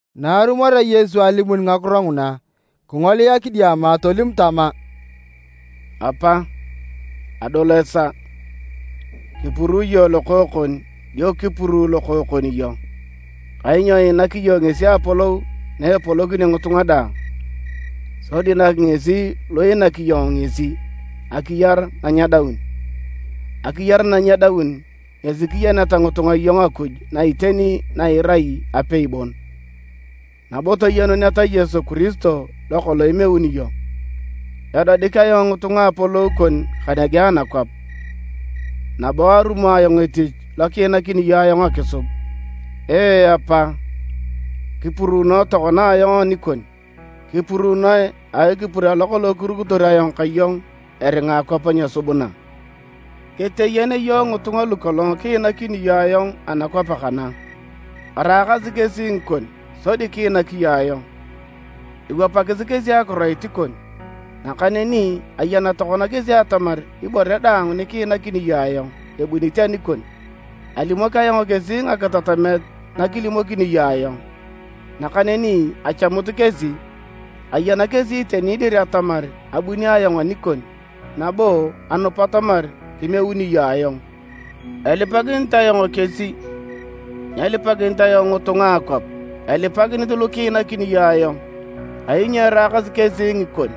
Na arumorea Yesu alimun ngakiro nguna, kingolia kidiama tolim tama, “Apa, adol esaa. Kipuruu iyong Lokookon dio kipuruu Lokookon iyong. Kainyo iinak iyong ngesi apolou na epolokinio ngitunga daang, sodi nak ngesi lu iinak iyong ngesi, akiyar na nyedaun. Akiyar na nyedaun ngesi kiyeneta ngitunga iyong Akuj na iteni na irai apei bon, nabo toyenuneta Yesu Kiristo lokolong imeuni iyong. Edodik ayong ngitunga apolou kon kanege anakwap, nabo arumo ayong etich lokiinakini iyong ayong akisub. Ee Apa! Kipuruunoe tokona ayong anikon. Kipuruunoe a ekipur alo kolong kirukitor ka iyong eringa akwap nyesubuna. “Keteyen iyong ngitunga lukolong kiinakini iyong ayong anakwap kana. Araakasi kesi ngikon sodi kiinak iyong ayong. Ewapakis kesi akiroit kon, nakaneni ayan tokona kesi atamar ibore daang nikiinakini iyong ayong ebunit anikon. Alimok ayong kesi ngakitatamet nakilimokini iyong ayong, nakaneni achamut kesi. Ayena kesi iteni dir atamar abuni ayong anikon, nabo anupa atamar kimeuni iyong ayong. “Elipakinit ayong kesi. Nyelipakinit ayong ngitunga a akwap, elipakinit lukiinakini iyong ayong, kainyo eraakasi kesi ngikon.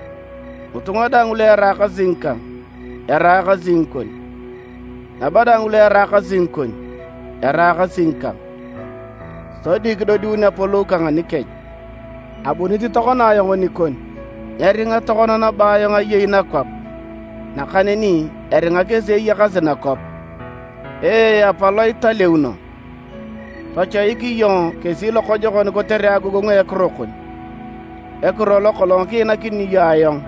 Ngitunga daang lueraakasi ngikang, eraakasi ngikon, nabo daang lueraakasi ngikon, eraakasi ngikang, sodi kidodiun apolou kang anikech. Abunit tokona ayong nikon. Nyeringa tokona nabo ayong ayei nakwap, nakaneni eringa kesi eyakasi nakwap. Ee Apa Lo italeuno, tochoik iyong kesi lokojokon kotere agogongu a ekiro kon, ekiro lokolong kiinakini iyong ayong,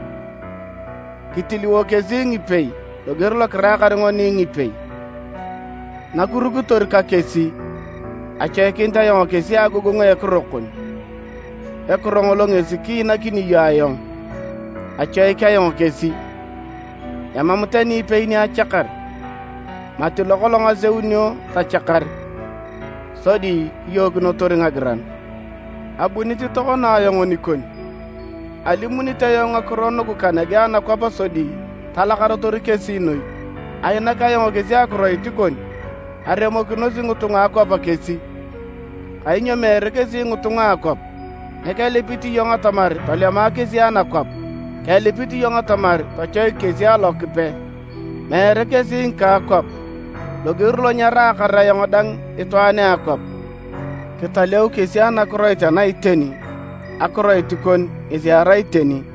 kitiliwo kesi ngipei loger lokiraakar ngoni ngipei. Nakirukitor ka kesi, achoikinit ayong kesi a agogongu a ekiro kon, ekiro ngolo kiinakini iyong ayong. Achoik ayong kesi, emam tani ipei ni achakar, mati lokolong aseunio tachakar, sodi kiyookinotor ngagiran. Abunit tokona ayong nikon, alimunit ayong ngakiro nugu kanege anakwap sodi talakarotor kesi noi. Ainak ayong kesi akiroit kon, aremokinosi ngitunga a akwap kesi, kainyo meere kesi ngitunga a ngakwap. Nyekelipit iyong atamar tolema kesi anakwap, kelipit iyong atamar tochoik kesi Alokipe. Meere kesi ngika akwap, loger lo nyaraakar ayong dang itwaan a akwap. Kitaleu kesi anakiroit ana iteni, akiroit kon ngesi erai iteni.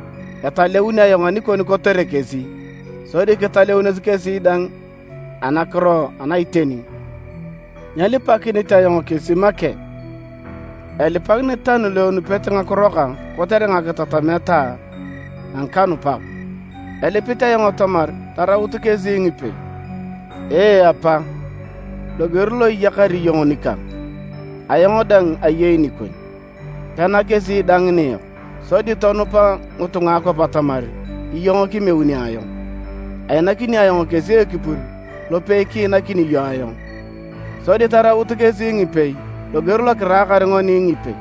Etaleun ayong anikon kotere kesi, sodi kitaleunos kesi dang anakiro ana iteni. “Nyelipakinit ayong kesi make, elipakinit tani luenupete ngakiro kang kotere ngakitatamet a ngikanupak. Elipit ayong atamar taraut kesi ngipei. Ee, Apa! Loger lo iyakar iyong nikang, ayong dang ayei nikon, pena kesi dang niyok, sodi tonupa ngitunga a akwap atamar iyong kimeuni ayong. Ainakini ayong kesi ekipur lopei kiinakini iyong ayong, sodi taraut kesi ngipei loger lokiraakar ngoni ngipei.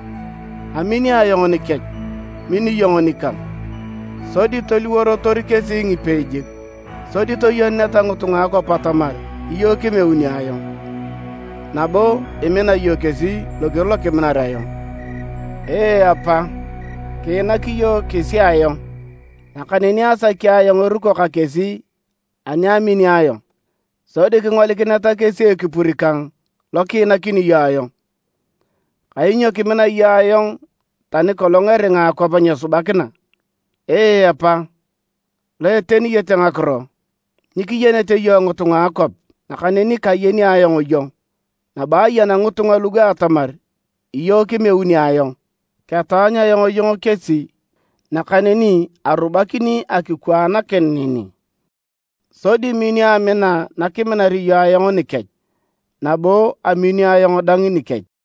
Amini ayong nikech, min iyong nikang, sodi toliworotor kesi ngipei jik, sodi toyenuneta ngitunga a akwap atamar iyong kimeuni ayong, nabo imina iyong kesi loger lokiminar ayong. “Ee Apa! Kiinak iyong kesi ayong, nakaneni asaki ayong eruko ka kesi ani amini ayong, sodi kingolikineta kesi ekipur kang lokiinakini iyong ayong, kainyo kimina iyong ayong tani kolong eringa akwap nyesubakina. Ee Apa lo eteniyete ngakiro! Nyikiyenete iyong ngitunga a akwap, nakaneni kayeni ayong iyong, nabo ayan ngitunga lugu atamar iyong kimeuni ayong. Ketaanyu ayong iyong kesi nakaneni arubakini akikwaanakin neni, sodi minio amina nakiminar iyong ayong nikech, nabo aminio ayong dang nikech.”